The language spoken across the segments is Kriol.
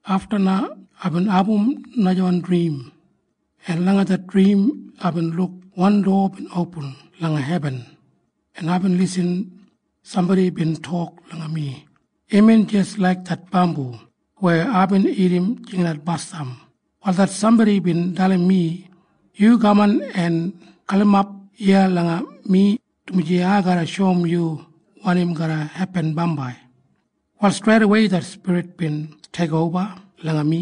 Afta na aibin abum najawan drim, en langa det drim aibin luk wan dowa bin opin langa hebin, en aibin lisin sambodi bin tok langa mi. Imbin jis laik det bambu weya aibin irrim jingat basdam. Wal det sambodi bin dalim mi, “Yu kaman en galimap iya langa mi, dumaji ai garra shoum yu wanim garra hepin bambai.” Wal streidawei det Spirit bin teikoba langa mi,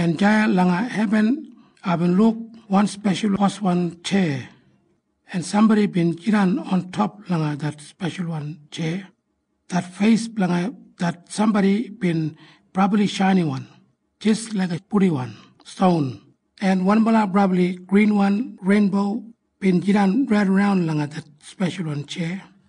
en deya langa hebin aibin luk wan speshal boswan tjeya, en sambodi bin jidan ontop langa det speshalwan tjeya. Det feis blanga det sambodi bin brabli shainiwan jis laiga purdiwan ston, en wanbala brabli grinwan reinbo bin jidan raidaran langa det speshalwan tjeya.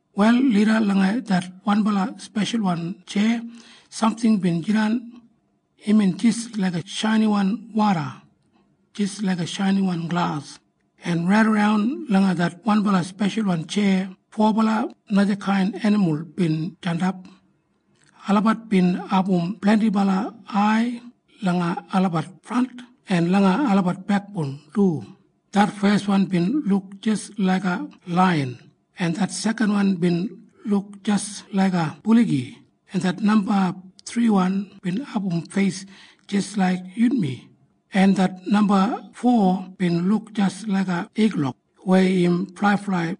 Wal lida langa det wanbala speshalwan tjeya samting bin jidan. Imbin jis laiga shainiwan woda, jis laiga shainiwan glas. En raidaran langa det wanbala speshalwan tjeya fobala najakain enimul bin jandap. Olabat bin abum blendibala ai langa olabat frant en langa olabat bekboun du. Det feswan bin luk jis laiga laiyan, en det sekanwan bin luk jis laiga buligi, en det namba thriwan bin abum feis jis laik yunmi, en det namba fo bin luk jis laiga igulok weya im flaiflai.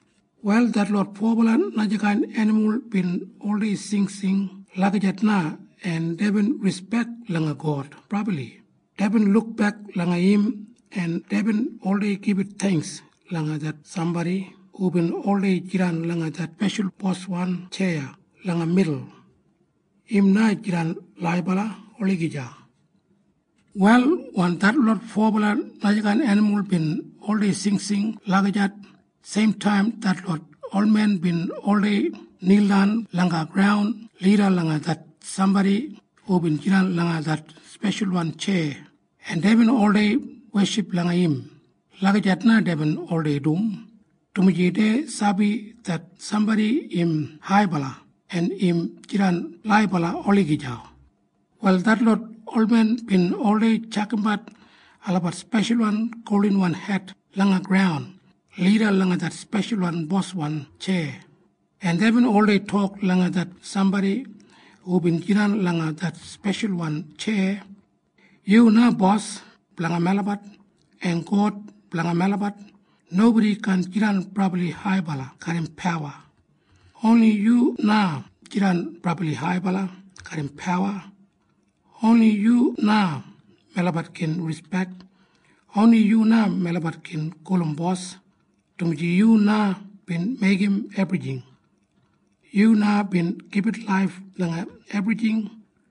Wal detlot fobala najakain enimul bin oldei singsing lagijat na. En deibin rispek langa God brabli, en deibin oldei gibit theingks garram song langa det sambodi hubin oldei jidan langa det speshalwan boswan tjeya langa midul. Im na jidan laibala olagija. Wal wen detlot fobala najakain enimul bin oldei singsing lagijat, seimtaim detlot olmen bin oldei nildan langa graun lida langa det sambodi hubin jidan langa det speshalwan tjeya, en deibin oldei weship langa im. Lagijat na deibin oldei dum, dumaji dei sabi det sambodi im haibala en im jidan laibala olagija. Wal detlot olmen bin oldei tjakamdanbat olabat speshalwan goldinwan het langa graun lida langa det speshal boswan tjeya, en deibin oldei tok langa det sambodi hubin jidan langa det speshalwan tjeya. “Yu na Bos blanga melabat en God blanga melabat. Nobodi kaan jidan brabli haibala garram pawa. Oni yu na jidan brabli haibala garram pawa. Oni yu na melabat gin rispek. Oni yu na melabat gin gulum Bos. Dumaji yu na bin meigim ebrijing. Yu na bin gibit laif langa ebrijing,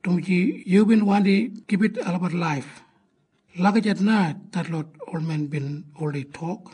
dumaji yubin wandi gibit olabat laif.” Lagijat na detlot olmen bin oldei tok.